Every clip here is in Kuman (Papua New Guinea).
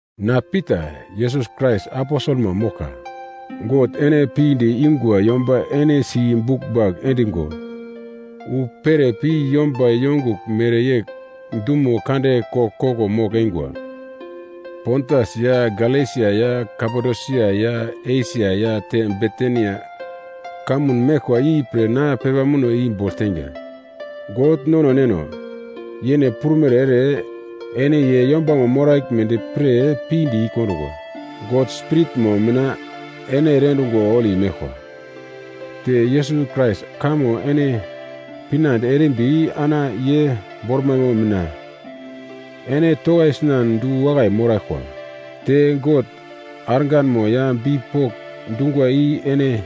Na Pita, Yesus Krais aposelmo moglka. God ene pinde ingwa yomba ene si buglmbagl endigo wu pere pi yomba yongugl mereyegl dumo kande koglkoglo mogl-eingwa Pontas ya Galesia ya Kapadosia ya Esia ya te Bitinia kamun meglkwa ipre na pepa muno i bogl teinga. God nono Neno, yene prumere ere, ene ye yombamo moraglmedi pre pinde i-kondungwa. God Spiritmo mina ene ere endungo holi meglkwa te Yesus Krais kamo ene pinande erimbi ana ye bormaimo mina ene tokaisinan du-wakai moraglkwa. Te God arganmo ya bipok dungwa i ene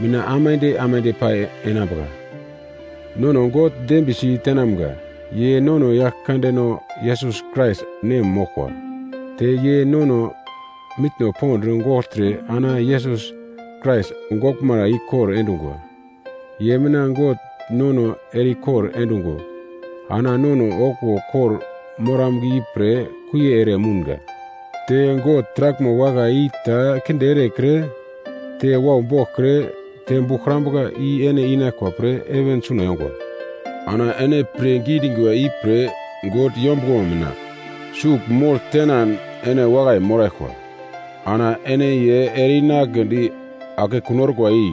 mina aimande aimande pai enambuka. Nono God dembiyesi tenamga, ye nono Yaglkandeno Yesus Krais nem moglkwa. Te ye nono mitno pond gogltre ana Yesus Krais goglmara ikor endungwa. Ye mina God nono ere-ikor endungo ana nono okuwo kor-moramga ipre kuie ere mounga. Te God taraglmo wakai i ta kinde erekre, te wau boglkre te buglkrambuka i ene inaglkwa pre heven suna yongwa. Ana ene pirngi dingwa ipre God yombuglomo mina sugl mogl tenan ene wakai moraglkwa. Ana ye ene ere-inagledi akekun orkwa i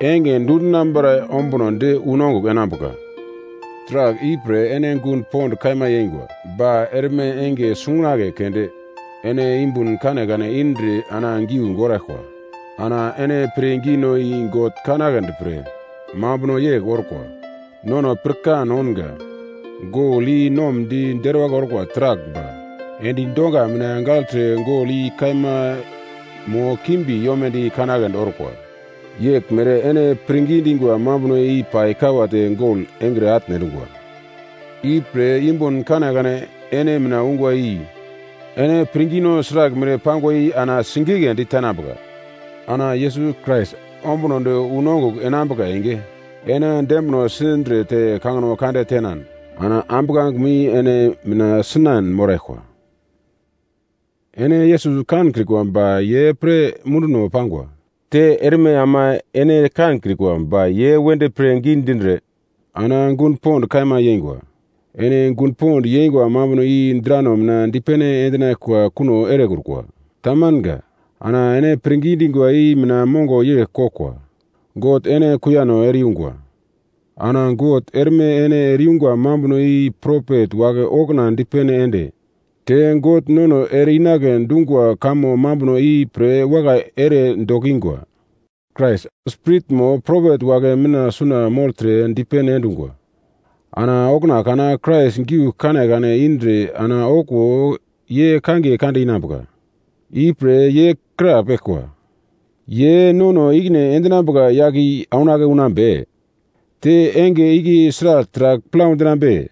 enge dundinambara ombunodi unongugl enambuka. Taragl ipre ene gun pond kaima yeingwa, ba erme enge sungunagle keunde ene yumbun kanekane indre ana giu goraglkwa. Ana ene pirngino i God kanagledi pre mambuno yegl orkwa. Nono pirkan ounga, gol i nomdi deruwagl orkwa taragl ba endi donga mina gagltre gol i kaima mo kimbi yomedi kanagledi orkwa. Yeglmere ene pirngi dingwa mambuno i pai kawate gol engre atne endungwa. Ipre yumbun kanekane ene mina ungwa i ene pirngino sraglmere pangwa i ana sigigledi tenambuka. Ana Yesus Krais ombunodi unongugl endinambuka enge, ene dembino sindre te kangino kande tenan ana ambuglangemo i ene mina sinan moraglkwa. Ene Yesus kankrikwa ba ye pre munduno pangwa. Te erme ama ene kankrikwa ba ye wedi pirngi dindre ana gun pond kaima yeingwa. Ene gun pond yengwa mambuno i drano mina dipene endinaglkwa kuno erekrukwa. Tamanga. Ana ene pirngi dingwa i mina mongo yegl koglkwa: God ene kuiyano ere-yungwa. Ana God erme ene ere-yungwa mambuno i propet wagle okuna dipene ende, te God nono ere-inagle dungwa kamo mambuno ipre wakai ere dokingwa. Krais Spiritmo propet wagle mina suna mogltre dipene endungwa, ana okuna kana Krais giugl kanekane indre ana okuwo ye kangiye kande inambuka. Ipre ye krapeglkwa, “Ye nono i-ikine endinambuka yagle i aunake unambe? Te enge igle sragl taragl plau dinambe?”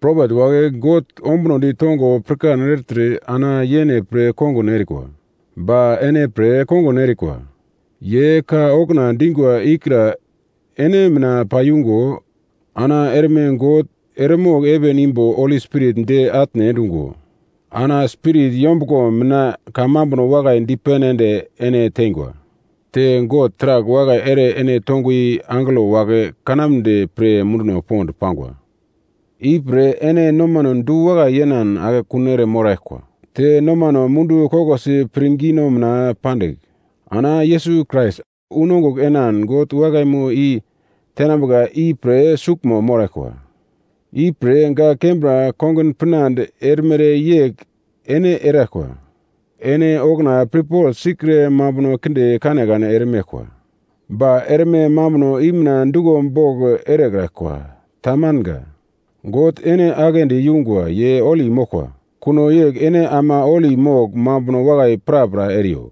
Propet wagle God ombunodi tongo pirkan ertre ana yene pre kongun erekrikwa, ba ene pre kongun erikwa. Ye ka okuna dingwa ikra ene mina paiyungo ana erme God eremogl heven imbo Holi Spirit di atne endungo ana Spirit yombuglo mina kamambuno wakai dipene ende ene tengwa. Te God taragl wakai ere ene tongwa i angelo wagle kanamnedi pre munduno pond pangwa. Ipre ene nomano du-wakai yenan akekun eremoraglkwa. Te nomano mundu koglosi pirngino mina pandigl, ana Yesus Krais unongugl enan God wakaimo i tenambuka ipre suglmo moraglkwa. Ipre gak kembra kongun pinande erimere yegl ene eraglkwa. Ene okuna pirpogl sikre mambuno kinde kanekane eremeglkwa. Ba erme mambuno i mina duglo bogl erekraglkwa. Tamanga. God ene aglendi yungwa ye holi moglkwa, kuno yegl ene ama holi mogl mambuno wakai prapra eriyo.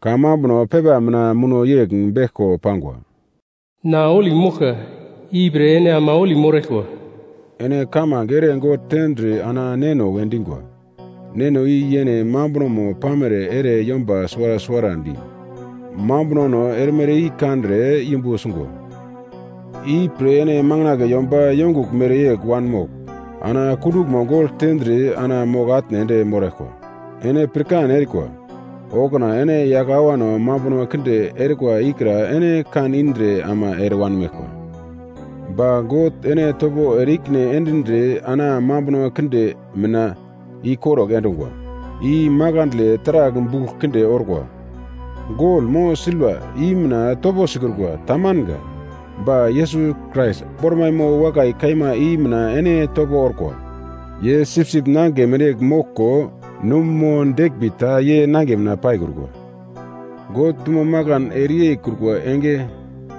Kamambuno pepa mina muno yegl beglko pangwa: “Na holi moglka, ipre ene ama holi moraglkwa.” Ene kamange ere God tendre ana Neno we dingwa. Neno i yene mambunomo pamere ere yomba suwara suwarandi mambunono erimere i kandre yumbu sungwa. Ipre ene makandle yomba yongugl mereyegl wanmogl ana kunduglmo gogl tendre ana mogl-atne ende moraglkwa. Ene pirkan erikwa, okuna ene yagl awano mambuno kinde erikwa ikra ene kan indre ama ere wanmeglkwa. Ba God ene topo ere i-ikine endindre ana mambuno kinde mina ikorugl endungwa, i makandle taragl bugl kinde orkwa, gol mo silva i mina topo sikrukwa tamanga. Ba Yesus Krais bormaimo wakai kaima i mina ene topo orkwa. Ye sipsip nangigle mereyegl moglko num mo deglmbi ta ye nangiye mina paikrukwa. God dumo makan ereyeikrukwa enge,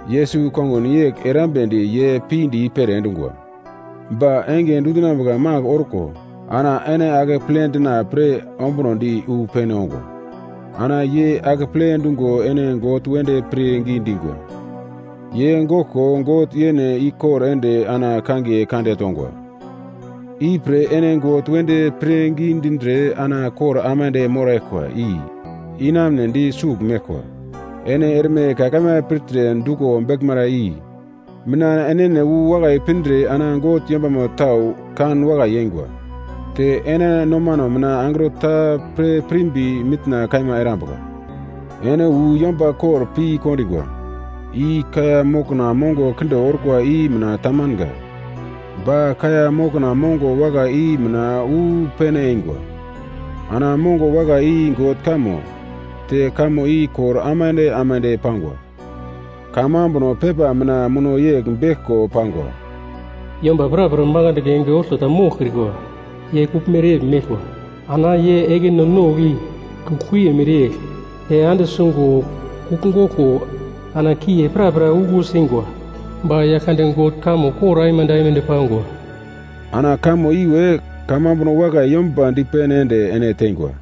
Yesus kongun yegl erambedi ye pinde i-pere endungwa. Ba enge dundinambuka mangigl orko ana ene akeple dina pre ombunodi wu pene ongwa. Ana ye akeple dungo ene God wedi pirngi dingwa. Ye goglko God yene ikor ende ana kangiye kande tongwa. Ipre ene God wedi pirngi dindre ana kor aimande moraglkwa i inamunedi sugl meglkwa. Ene erme ka kaima pirtre duglo beglmara i mina enene wu wakai pindre ana God yombama tau kanwakai yeingwa, te ene nomano mina angro ta pre pirmbi mitna kaima erambuka. Ene wu yomba kor pi kondingwa, i kaiya mokna mongo kinde orkwa i mina tamanga. Ba kaiya mokna mongo wakai i mina wu pene eingwa. Ana mongo wakai i God kamo, te kamo i kor aimande aimande pangwa. Kamambuno pepa mina muno yegl beglko pangwa: “Yomba prapra makandle enge olto ta moglkrikwa. Ye kugl mereyegl meglkwa. Ana ye ekino nogl i kugl-kuiye mereyegl, te ande sungo kugl goglko ana kuiye prapra uglusingwa. Ba Yaglkande God kamo kor aimande aimande pangwa.” Ana kamo iwe kamambuno wakai yomba dipene ende ene teingwa.